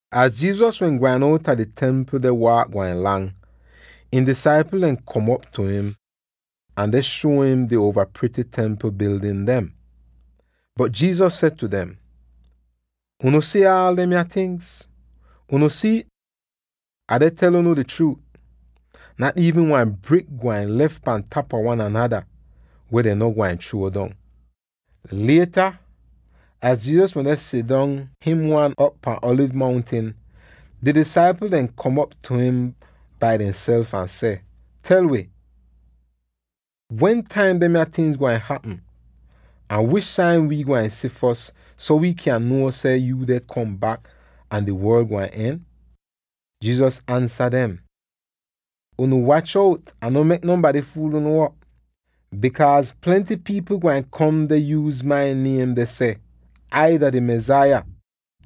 Az Jesus wehn gwain outa di Templ deh waak gwain lang, ihn disaipl dem kom op tu im ahn deh shuo im di uova prity Templ bildin dem. Bot Jesus seh tu dem, “Unu si aal demya tingz, unu si'it? Ah deh tel unu di chruut: nat iivn wan brik gwain lef pan tapa wan anada, weh dehn no gwain chruo dong.” Lieta, wen Jesus wende sidong him wan op pahn Alivz Mountin, di disaipl dem kom op tu im bai dehnself ahn seh, “Tel wi, wentaim demya tingz gwain hapm, ahn wish sain wi gwain si fos so wi kyan nuo seh yu deh kom bak ahn di worl gwain en?” Jesus ansa dem, “Unu wach out ahn no mek nonbady fuul unu op, bikaaz plenty pipl gwain kom deh yuuz mai niem deh seh, ‘Ai dah di Mesaya!’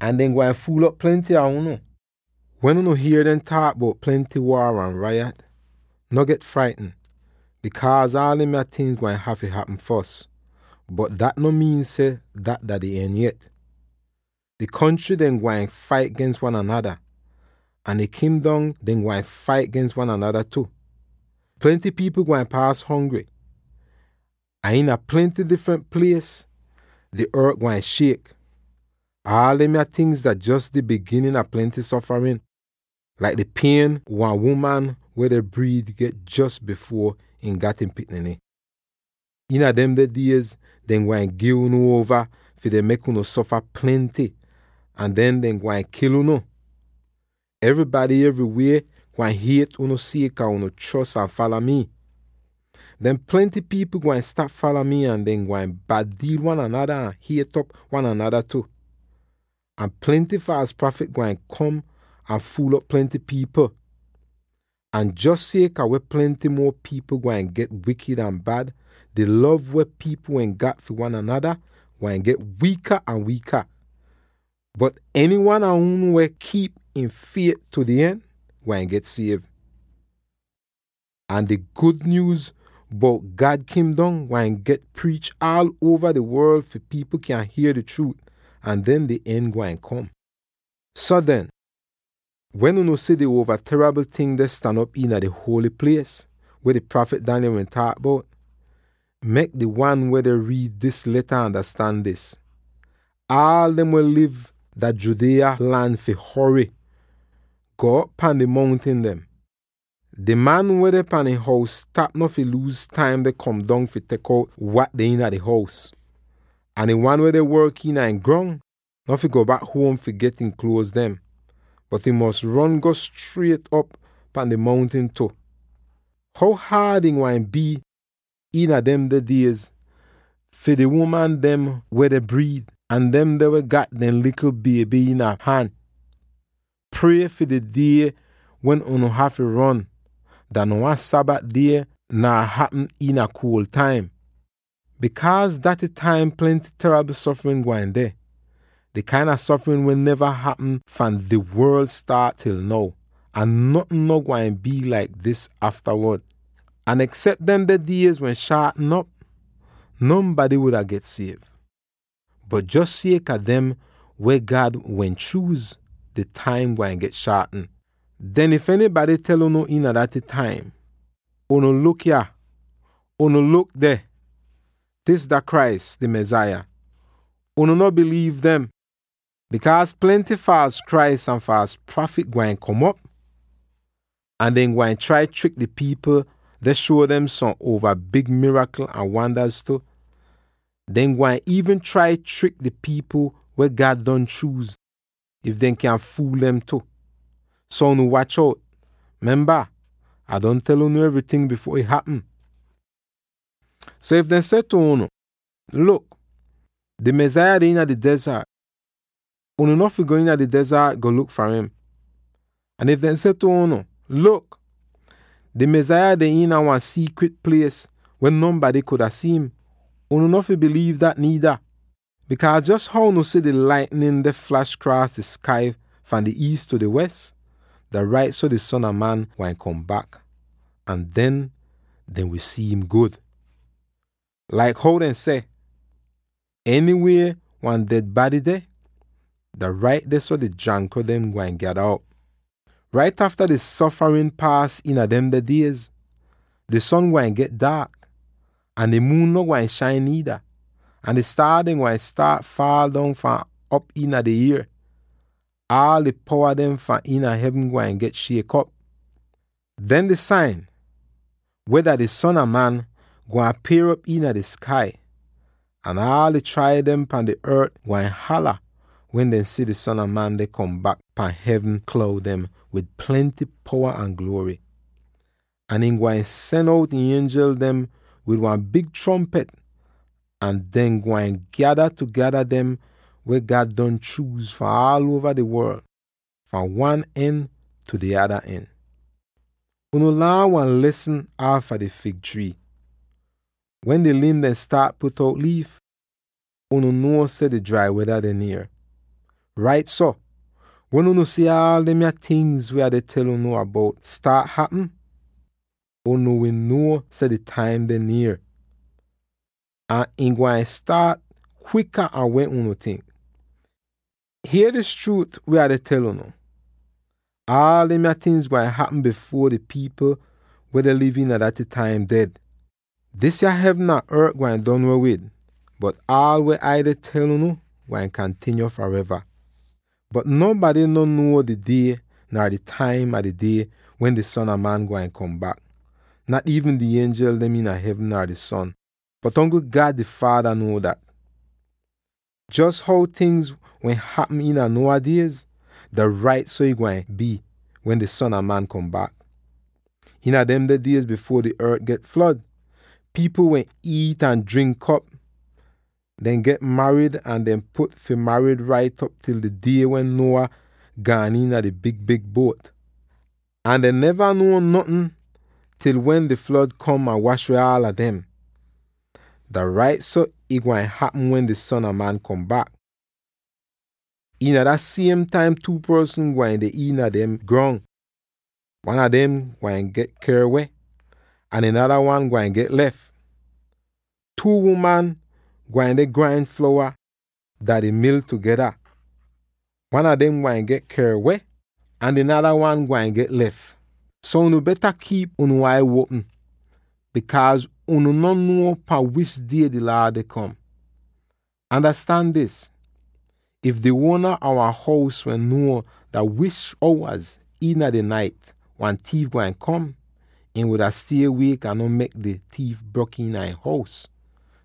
Ahn dehn gwain fuul'op plenty a unu. Wen unu hier dehn taak bout plenty waar ahn rayat, no get fraitn, bikaaz aal demya tingz gwain hafy hapm fos, bot dat no miin seh dat dah di en yet. Di kontry dem gwain fait gens wan anada, ahn di kingdom dem gwain fait gens wan anada tu. Plenty pipl gwain paas hongry, ahn iina plenty difrent plies di ort gwain shiek. Aal demya tingz dah jos di biginin a plenty sofarin, laik di pien wan uman weh deh briid get jos bifuor ihn gat ihn pikniny. “Iina demde diez dehn gwain gi unu uova fi dehn mek unu sofa plenty ahn den dehn gwain kil unu. Evrybady evrywie gwain hiet unu sieka unu chros ahn fala mii. Den, plenty pipl gwain stap fala mi ahn dehn gwain bad-diil wan anada ahn hiet'op wan anada tu. Ahn plenty faals prafit gwain kom ahn fuul'op plenty pipl. Ahn jos sieka weh plenty muo pipl gwain get wikid ahn bad, di lov weh pipl wehn gat fi wan anada gwain get wiika ahn wiika. Bot enywan a unu weh kiip ihn fiet tu di en, gwain get siev. Ahn di gud nyuuz bout God Kingdom gwain get priich aal uova di worl fi pipl kyan hier di chruut, ahn den di en gwain kom. “So den, wen unu si di Uova Teribl Ting deh stan op iina di Holy Plies, weh di prafit Daniel wehn taak bout —mek di wan weh deh riid dis leta andastan dis— aala dem weh liv dah Judea lan fi hory, go'op pan di mountin dem. Di man weh deh pan ihn hous-tap no fi luuz taim deh kom dong fi tek out wat deh iina di hous, ahn di wan weh deh work iina ihn grong no fi go bak huom fi get ihn kluoz dem, bot ihn fi ron go striet op pan di mountin tu. How haad ih gwain bii iina demde diez fi di uman dem weh deh briid, ahn demde weh gat dehn likl bieby iina han! Prie fi di die wen unu hafy ron, dah no wan Sabat die nar hapm iina kuol taim, bikaaz iina daty taim plenty teribl sofarin gwain deh, di kain a sofarin weh neva hapm fahn di worl staat til now, ahn notn no gwain bii laik dis aftawod. Ahn eksep demde diez wehn shaatn op, nonbady wuda get siev; bot jos sieka dem weh God wehn chuuz, di taim gwain get shaatn. “Den if enybady tel unu: ‘Unu luk yah!’ or, ‘Unu luk deh! Dis dah Christ, di Mesaya!’ unu no biliiv dem. Bikaaz plenty faals Christ ahn faals prafit gwain kom op. Ahn dehn gwain trai trik di pipl dem deh shuo dem som uova big mirakl ahn wandaz tu. Dehn gwain iivn trai trik di pipl weh God don chuuz, if dehn kyan fuul dem tu. So unu wach out! Memba, Ah don tel unu evryting bifuor ih hapm. “So if dehn seh tu unu, ‘Luk! Di Mesaya deh iina di dezart,’ unu no fi go iina di dezart go luk far im. Ahn if dehn seh tu unu, ‘Luk! Di Mesaya deh iina wan siikrit plies weh nonbady kuda si'im,’ unu no fi biliiv dat niida. Bikaaz jos how unu si di laitnin deh flash kraas di skai fahn di iis tu di wes, dah rait so di Son a Man gwain kom bak, ahn den dehn wi si'im gud. “Laik how dehn seh, ‘Enywie weh wan ded bady deh, dah rait dehso di jankro dem gwain gyada op.’ “Rait afta di sofarin paas iina demde diez, di son gwain get daak, ahn di muun no gwain shain niida, ahn di staar dem gwain faal dong fahn op iina di ier; aal di powa dem fahn iina hevn gwain get shiek op. Den di sain weh dah di Son a Man, gwain apier'op iina di skai, ahn aal di traib dem pahn di ort gwain hala wen dehn si di Son a Man deh kom bak pahn hevn kloud dem wid plenty powa ahn gluory. Ahn ihn gwain sen out ihn ienjel dem wid wan big trompit ahn dehn gwain gyada tugeda dem weh God don chuuz fahn aal uova di worl, fahn wan en tu di ada en. “Unu laan wan lesn aafa di fig trii: wen di lim dem staat put out liif, unu nuo seh drai weda deh nier. Rait so, wen unu si aal demya tingz weh Ah deh tel unu bout staat hapm, unu wi nuo seh di taim deh nier, ahn ih gwain staat kwika an weh unu tink. Hier dis chruut weh Ah deh tel unu: Aal demya tingz gwain hapm bifuor di pipl weh deh liv iina daty taim ded. Disya hevn ahn ort gwain don weh wid, bot aal weh Ai deh tel unu gwain kantinyo fareva. “Bot nonbady no nuo di die, nar di taim a di die wen di Son a Man gwain kom bak; nat iivn di ienjel dem iina hevn, nar di Son, bot ongl God di Faada nuo dat. Jos how tingz wehn hapm iina Noah diez, dah rait so ih gwain bii wen di Son a Man kom bak. Iina demde diez bifuor di ort get flod, pipl wende iit ahn drink op, deh get marid ahn deh put fi marid rait op til di die wen Noah gaan iina di big-big buot. Ahn dehn neva nuo notn til wen di flod kom ahn wash weh aala dem. Dah rait so ih gwain hapm wen di Son a Man kom bak. Iina dah siem taim two porsn gwain deh iina dehn grong; wan a dem gwain get ker weh, ahn di nada wan gwain get lef. Two uman gwain deh grain flowa dah di mil tugeda; wan a dem gwain get ker weh, ahn di nada wan gwain get lef. So unu beta kiip unu ai uopm, bikaaz unu no nuo pahn wish die yo Laad deh kom. Andastan dis: if di uona a wan hous wehn nuo dah wish owaz iina di nait wan tiif gwain kom, ihn wuda stie wiek ahn no mek di tiif brok iina ihn hous.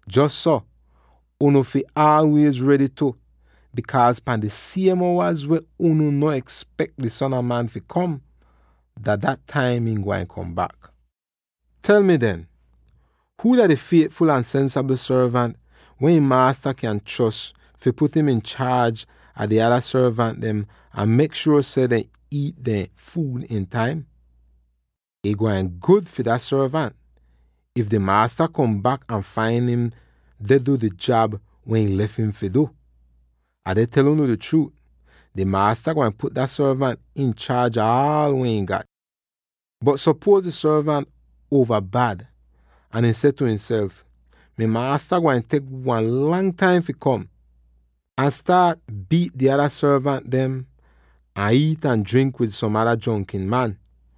Jos so, unu fi aalwiez redy tu, bikaaz pahn di siem owaz weh unu no espek di Son a Man fi kom, dah dat taim ihn gwain kom bak. “Tel mi den: huu dah di fietful ahn sensabl sorvant weh ihn maasta kyan chros fi put im inchaaj a di ada sorvant dem ahn mek shuor seh dehn iit dehn fuud iin taim? Ih gwain gud fi dah sorvant, if di maasta kom bak ahn fain im deh du di jab weh ihn lef im fi du! Ah deh tel unu di chruut: di maasta gwain put dah sorvant inchaaj ah aal weh ihn gat. Bot supuoz di sorvant uova bad ahn ihn seh tu ihnself, ‘Mi maasta gwain tek wan lang taim fi kom,’ ahn ihn staat biit di ada sorvant dem, ahn iit ahn drink wid som ada jronkin man.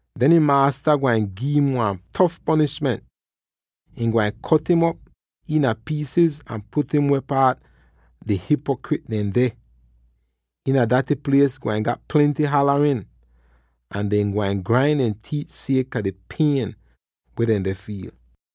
Den ihn maasta gwain gi'im wan tof ponishment; ihn gwain kot'im op iina piisiz ahn put im weh paat di hipokrit dem deh. Iina daty plies gwain gat plenty halarin, ahn dehn gwain grain dehn tiit sieka di pien weh dehn deh fiil.